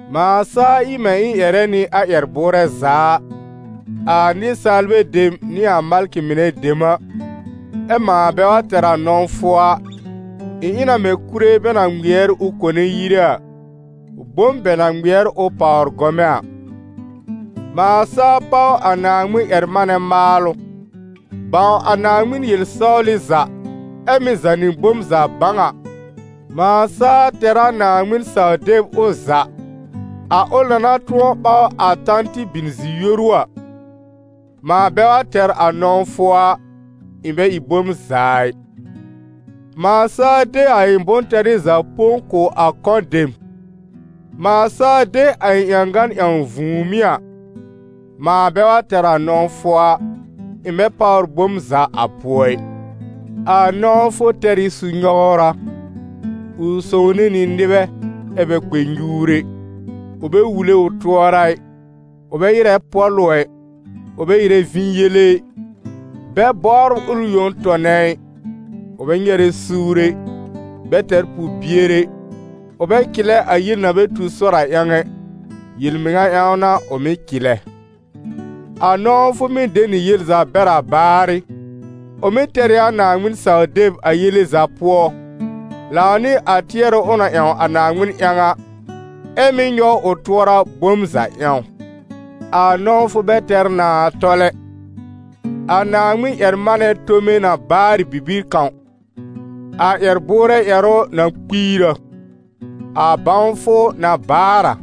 Mãa saa ɩ mɛ̃ ɩ̃ ƴɛrɛ nɩ a ƴɛr-bʋʋrɛ za a, a nɩsaalbɛ dem nɩ a malkɩ mɩnɛ dem a, ɛ mãa bɛ wa tɛr a nɔ̃wfʋ a, ɩ̃ ɩ na mɛ̃ kúre bɛ na ŋmɩɛr ʋ kone yire a, bom bɛ na ŋmɩɛr ʋ pàwr gɔmɛ̃ a. Mãa saa páw a Naaŋmɩn-ƴɛr-manɛ maalʋ, bãw a Naaŋmɩn yel-sɔwlɩ za, ɛ mɩ́ zànɩ bom za bãw a, mãa saa tɛr a Naaŋmɩn-saw-deb ʋ za, a ʋl na na tʋ̃ɔ ɓaw a tan tɩ bin zi-yoru a, mãa bɛ wa tɛr a nɔ̃wfʋ a, ɩ̃ bɛ ɩ bom za ɩ. Mãa saa de a ɩ̃ bʋ̃-tɛrɩ za põ kʋ̀ a kɔ̃ dem, mãa saa de a ɩ̃ ƴãgan ƴãw vũùmí a, mãa bɛ wa tɛr a nɔ̃wfʋ a, ɩ̃ bɛ páwr bom za a pʋɔ ɩ. A nɔ̃wfʋ tɛr ɩ su-nyɔwra, ʋ sõwne nɩ nɩbɛ, ɛ bɛ kpɛ nyuur ɛ, ʋ bɛ wule ʋ tʋɔra ɩ, ʋ bɛ ɩrɛ pɔ̀lʋ ɛ, ʋ bɛ ɩrɛ vĩ yele ɩ, bɛ bɔbr ʋl yõ tɔnɛ ɩ, ʋ bɛ nyɛrɛ suur ɛ, bɛ tɛr pʋ-bier ɛ, ʋ bɛ cɩlɛ a yel na bɛ tu sɔr a ƴãw ɛ, yel-mɩŋa ƴãw n'a ʋ mɩ́ cɩlɛ. A nɔ̃wfʋ mɩ́ de nɩ yel za bɛr a baarɩ, ʋ mɩ́ tɛr ɩ a Naaŋmɩn-saw-deb a yele za pʋɔ, lãw nɩ a tɩɛrʋ ʋ na ƴãw a Naaŋmɩn ƴãw a, ɛ mɩ́ nyɔw ʋ tʋɔra bom za ƴãw. A nɔ̃wfʋ bɛ tɛr nãà tɔl ɛ. A Naaŋmɩn-ƴɛr-manɛ tome na baar ɩ bibir kãw, a ƴɛr-bʋʋrɛ ƴɛrʋ na kpiir a, a bãwfʋ na baar a.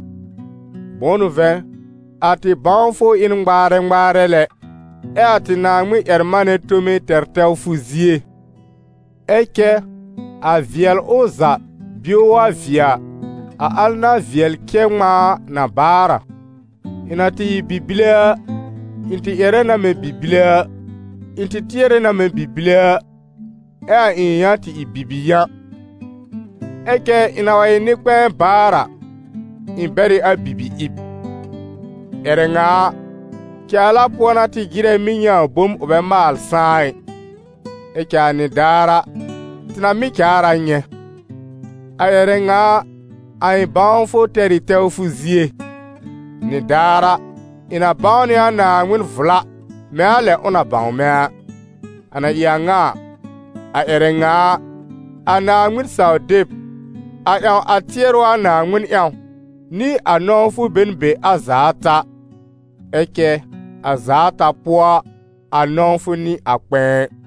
Bʋ̃ʋ n'ʋ vɛ̃, a tɩ bãwfʋ ɩ n ŋmaarɛ ŋmaarɛ lɛ, ɛ a tɩ Naaŋmɩn-ƴɛr-manɛ tome tɛr tɛwfʋ zie. Ɛ cɛ a vɩɛlʋ za bio wa vɩɛ a, a al na vɩɛl cɛ ŋmãa a, na baar a. Ɩ̃ na tɩ ɩ bi-bile a, ɩ̃ tɩ ƴɛrɛ na mɛ̃ bi-bile a, ɩ̃ tɩ tɩɛrɛ na mɛ̃ bi-bile a, ɛ a ɩ̃ yã tɩ ɩ bibi-yã. Ɛ cɛ ɩ̃ na wa ɩ nɩ-kpɛ̃ɛ baar a, ɩ̃ bɛr ɩ a bi-bi-ɩb. Ƴɛrɛ ŋa a, caala pʋɔ n'a tɩ jɩrɛ mɩ́ nyɛ̃ a bom ʋ bɛ maal sãá ɩ, ɛ cɛ a nɩdaar a, tɩ na mɩ́ caar a nyɛ̃. A ƴɛrɛ ŋa a, a ɩ̃ bãwfʋ tɛr ɩ tɛwfʋ zie, nɩdaar a, ɩ̃ na bãw nɩ a Naaŋmɩn vla mɛ̃ a lɛ ʋ na bãw mɛ̃ a. A na ɩ a ŋa a, a ƴɛrɛ ŋa a, a Naaŋmɩn-saw-deb, a ƴãw a tɩɛrʋ a Naaŋmɩn ƴãw, nɩ a nɔ̃wfʋ be n be a za ata, ɛ cɛ a za ata pʋɔ a, a nɔ̃wfʋ n'ɩ a kpɛ̃ɛ.